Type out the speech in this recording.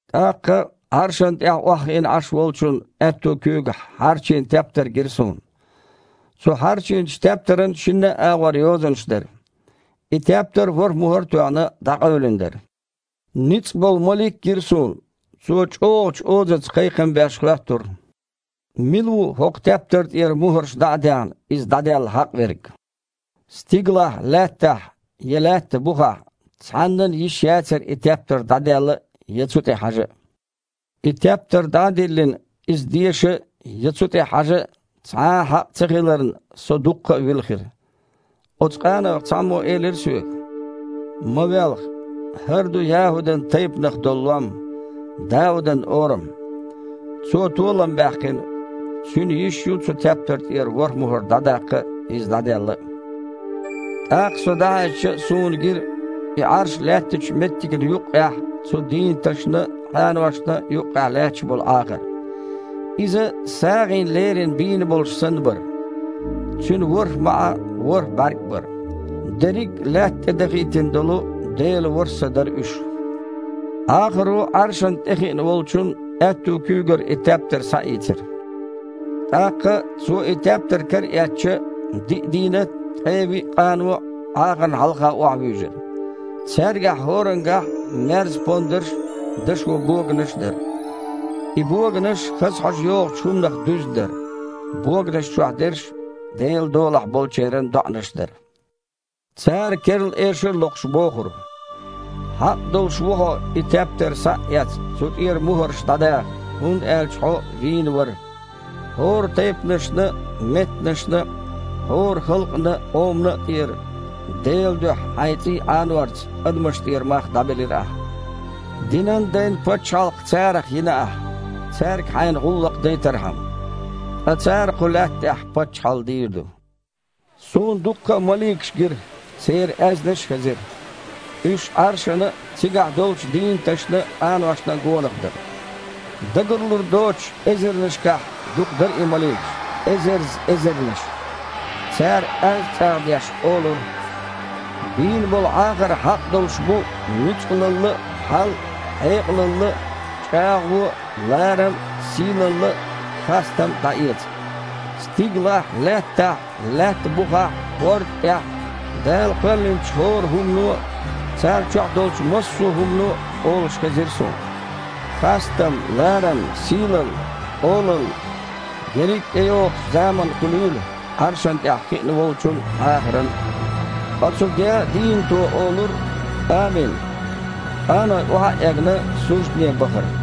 ТІаккха Іаршана тІехь охьахиъна Іаш Волчун аьтту куьйгахь хьарчийна тептар гира суна. Цу хьарчийначу тептаран шинна а агІор йозанаш дара. И тептар, ворхІ мухІар а тоьхна, дІакъевлина дара. Ницкъболу малик а гира суна. Цо, чІогІачу озаца кхайкхам беш, хоьттура: «Мила ву, хІокху тептар тІера мухІарш дІа а даьхна, иза дІаделла хьакъ верг?» Стигалахь, лаьттахь, я лаьтта бухахь цхьаннан а йиш яцара и тептар дІаделла а, я цу тІе хьажа а. И тептар дІа а диллина, иза деша а, я цу тІе хьажа а цхьа а хьакъ цахиларна, со дуккха а вилхира. Оцу къанойх цхьаммо элира соьга: «Ма велха! ХІара ду ЯхІудан тайпанах долу Лом: Даудан Орам. Цо толам баьккхина, Цуьнан йиш ю цу тептар тІера ворхІ мухІар дІадаккха а, иза дІаделла а». ТІаккха со дІахьаьжча, суна гира и Іарш лаьттачу меттигна юккъехь, цу дийнаташна а, къаношна а юккъехь лаьтташ болу Іахар. Иза, сагІина лерина бийна болуш санна, бара. Цуьнан ворхІ маІа а, ворхІ бІаьрг а бара. Дерриг а лаьтта тІедахийтина долу Делан ворхІ Са дара уьш. Іахаро Іаршана тІе хиъна Волчун аьтту куьйгара и тептар схьаийцира. ТІаккха, Цо и тептар караэцча, диъ дийнат а, ткъе виъ къано а Іахарна хьалха охьавуьйжира. Цаьргахь хІорангахь а мерз-пондарш а, дашо боганаш а дара. И боганаш хаза хьожа йогІучу хІуманах дуьзна дара. Боганаш чохь дерш Делан долахь болчеран доІанаш дара. Цара, керла эшар а локхуш, бохура: «Хьакъ долуш ву Хьо, и тептар схьа а эцна, цу тІера мухІарш дІадаха, хІунда аьлча Хьо вийна вара. ХІора тайпанашна а, меттанашна а, хІора халкъана а, къомана а тІера Делан дуьхьа Хьайн цІий Іанорца адамашна тІера мах дІабелира Ахьа. Динан дайн пачхьалкх царах йина Ахьа, цаьрга Хьайна гІуллакх дайтархьама. Ткъа цара кху Лаьтта тІехь паччахьалла дийр ду». Суна дуккха а маликаш гира, церан аьзнаш а хезира. Уьш Іаршана а, цигахь долчу дийнаташна а, къаношна а гонах дара. Дагарлур доцуш, эзарнашкахь дукха дара и маликаш – эзарзза эзарнаш. Цара, аз чІагІ а деш, олура: «Бийна болу Іахар хьакъ долуш бу нуьцкъалалла а, хьал а, хьекъалалла а, чІагІо а, ларам а, сийлалла а, хастам а дІаэца». Стигалахь а, лаьттахь а, лаьттана бухахь а, хІорда тІехь а Дала кхоьллинчу хІора хІумано а – царна чохь долчу массо хІумано а – олуш хезира суна: «Хастам, ларам, сийлалла, олалла ерриг а тІейогІучу заманна хуьлийла Іаршана тІехь хиъна Волчун а, Іахаран а». Ткъа цу деъа а дийнато олура: «Амин». Къаной, охьа а эгна, суждане бахара.